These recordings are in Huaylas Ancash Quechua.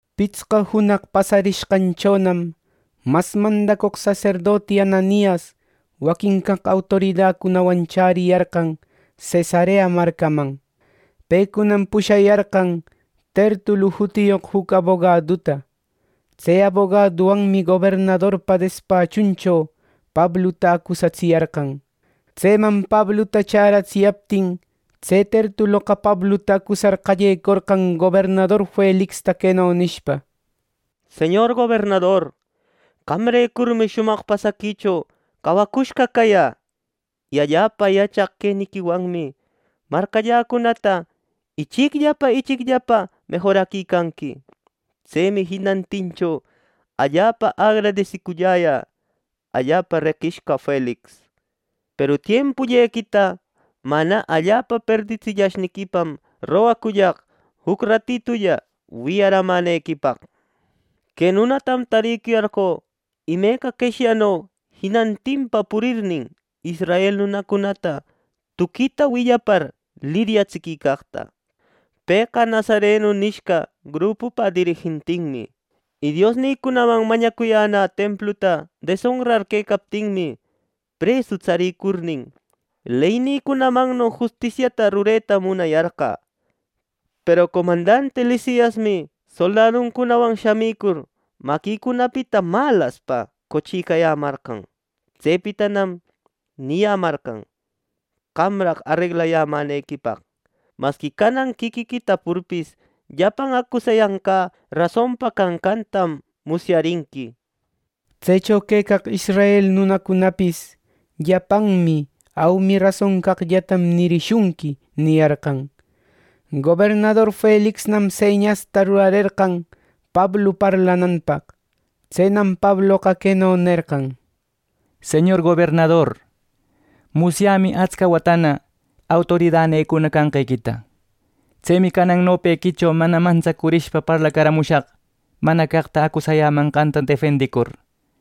Pitsqa junaq pasarishqanchonam mas mandacoq saserdoti Ananias waquin caq autoridacunawan chäriyarqan Cesarea marcaman. Pecunam pushayarqan Tertulu jutiyoq juc abogaduta. Tse abogaduwanmi gobernadorpa despachuncho Pabluta acusatsiyarqan. Tseman Pabluta chäratsiyaptin, tse Tertuloqa Pabluta acusar qallecorqan, gobernador Felixta queno nishpa: —Señor gobernador, qamrecurmi shumaq pasaquicho cawacushqa cayä. Y allapa yachaq queniquiwanmi marcalläcunata ichicllapa ichicllapa mejoraquicanqui. Tsemi jinantincho allapa agradesicullayan, allapa reqishqa Felix. Peru tiempullequita mana allapa perditsillashniquipam rogacullaq juc ratitulla wiyaramänequipaq. Que nunatam tariyarqö imeca qeshyano jinantinpa purirnin, israel nunacunata tuquita willapar liryatsiquicaqta. Pëqa Nazarenu nishqan grupupa dirijentinmi. Y Diosnïcunaman mañacuyäna templuta desonrar quecaptinmi, presu tsarïcurnin leynïcunamanno justisiata rureta munayarqä. ˻Peru comandanti Lisiasmi soldaduncunawan shamicurnin, maquïcunapita malaspa qochiyämarqan. Tsepitanam niyämarqan qamraq areglayämänequipaq.˼ Masqui canan quiquiqui tapurpis, llapan acusayanqä rasonpa canqantam musyarinqui. Tsecho quecaq israel nunacunapis: “Llapanmi aumi rason caqllatam nirishunqui” niyarqan. Gobernador Felixnam señasta rurarerqan Pablu parlananpaq. Tsenam Pabloqa queno nerqan: —Señor gobernador, musyämi atsca watana autoridanïcuna canqequita. Tsemi canan nopequicho mana mantsacurishpa parlacaramushaq mana caqta acusayämanqanta defendicur.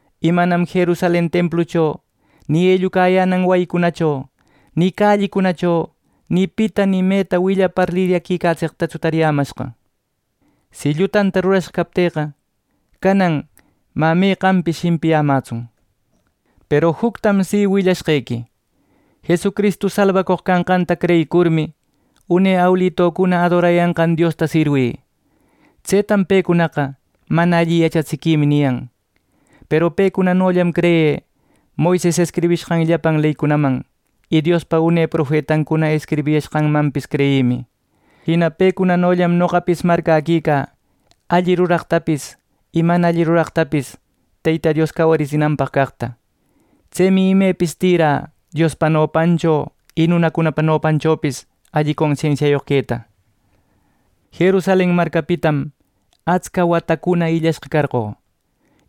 Y manam Jerusalen templucho ni ellucayänan wayicunacho ni callicunacho ni pita ni meta willapar liryatsiquicaqtatsu tariyämashqa. Si llutata rurashqa captïqa canan mä meqanpis shimpiyämätsun. Peru juctam si willashqequi: Jesucristu salbacoq canqanta creyïcurmi, une awilucuna adorayashqan Diosta sirwï. Tsetam pecunaqa mana alli yachatsiquimi niyan. Peru pecunanollam creyï Moises escribishqan llapan leycunaman, y Diospa une profetancuna escribiyashqancunamanpis creyïmi. Jina pecunanollam noqapis marcäquicä alli ruraqtapis y mana alli ruraqtapis Teyta Dios cawaritsinanpaq caqta. Tsemi imepis tïra, Diospa nopancho y nunacunapa nopanchopis alli consensiayoq queta. “Jerusalen marcapitam atsca watacuna illashqa carqö.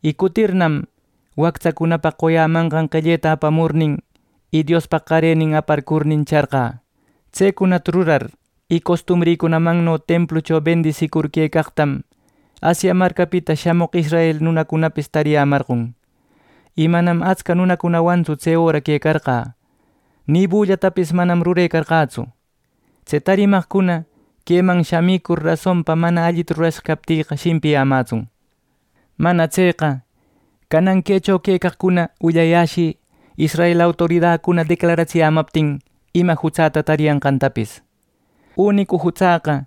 Y cutirnam, wactsacunapaq qoyämanqan qelleta apamurnin y Diospaq qarenin aparcurnin charqä. Tsecunata rurar y costumrïcunamanno templucho bendisicur quecaqtam Asia marcapita shamoq israel nunacunapis tariyämarqon. Y manam atsca nunacunawantsu tse öra quecarqä, ni bullatapis manam rurecarqätsu. Tse tarimaqcuna queman shamicur, rasonpa mana allita rurashqa captïqa shimpiyämätsun. Mana tseqa, canan quecho quecaqcuna willayäshï israel autoridacuna declaratsiyämaptin ima jutsäta tariyanqantapis. Unicu jutsäqa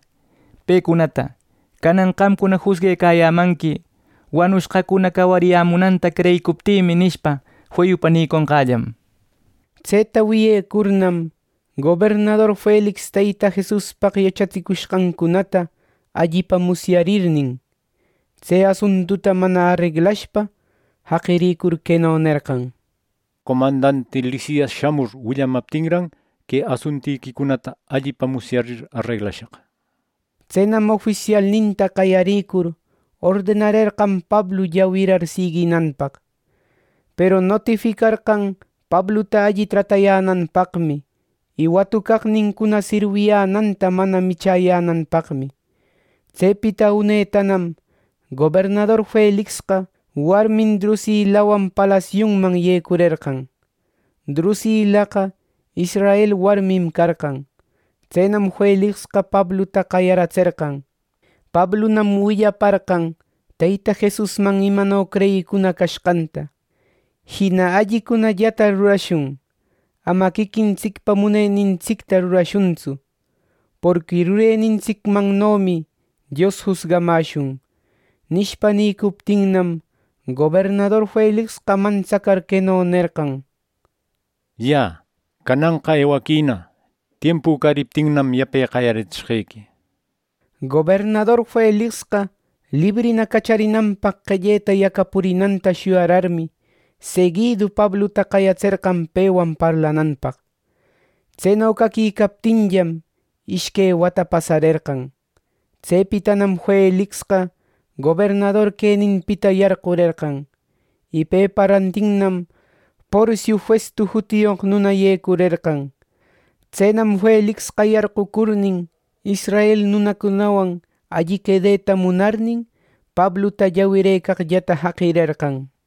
pecunata, ‘Canan qamcuna jusguecayämanqui, wanushqacuna cawariyämunanta creyicuptïmi’ nishpa, feyupa niconqällam. Tseta wiyecurnam, gobernador Felix Teyta Jesuspaq yachatsicushqancunata allipa musyarnin, tse asuntuta mana areglashpa jaqirïcur queno nerqan: —Comandanti Lisias shamur willamaptinran que asuntiquicunata allipa musyarir areglashaq —nir. Tsenam ofisialninta qayarïcur ordenarerqan Pablu llawirar siguinanpaq; peru notificarqan Pabluta alli tratayänanpaqmi y watucaqnincuna sirwiyänanta mana michäyänanpaqmi. Tsepita unetanam gobernador Felixqa warmin Drusilawan palasiunman yecurerqan. Drusilaqa israel warmim carqan. Tsenam Felixqa Pabluta qayaratserqan. Pablunam willaparqan Teyta Jesusman imano creyicuna cashqanta. Jina “Allicunallata rurashun. Ama quiquintsicpa munenintsicta rurashuntsu, porqui rurenintsicmannomi Dios jusgamäshun” nishpa nïcuptinnam, Gobernador Felixqa mantsacar queno nerqan: —Yä, cananqa ewaquïna. Tiempü cariptinnam, yape qayaratsishqequi —nishpa. Gobernador Felixqa librina cacharinanpaq qelleta yacapurinanta shuyararmi, seguidu Pabluta qayatserqan pewan parlananpaq. Tseno caquicaptinllam ishque wata pasarerqan. Tsepitanam Felixqa gobernador queninpita yarqurerqan y pepa rantinnam Porciu Festu jutiyoq nunana yecurerqan. Tsenam Felixqa yarqucurnin, israel nunacunawan alli quedeta munarnin, Pabluta llawirëcaqllata jaqirerqan.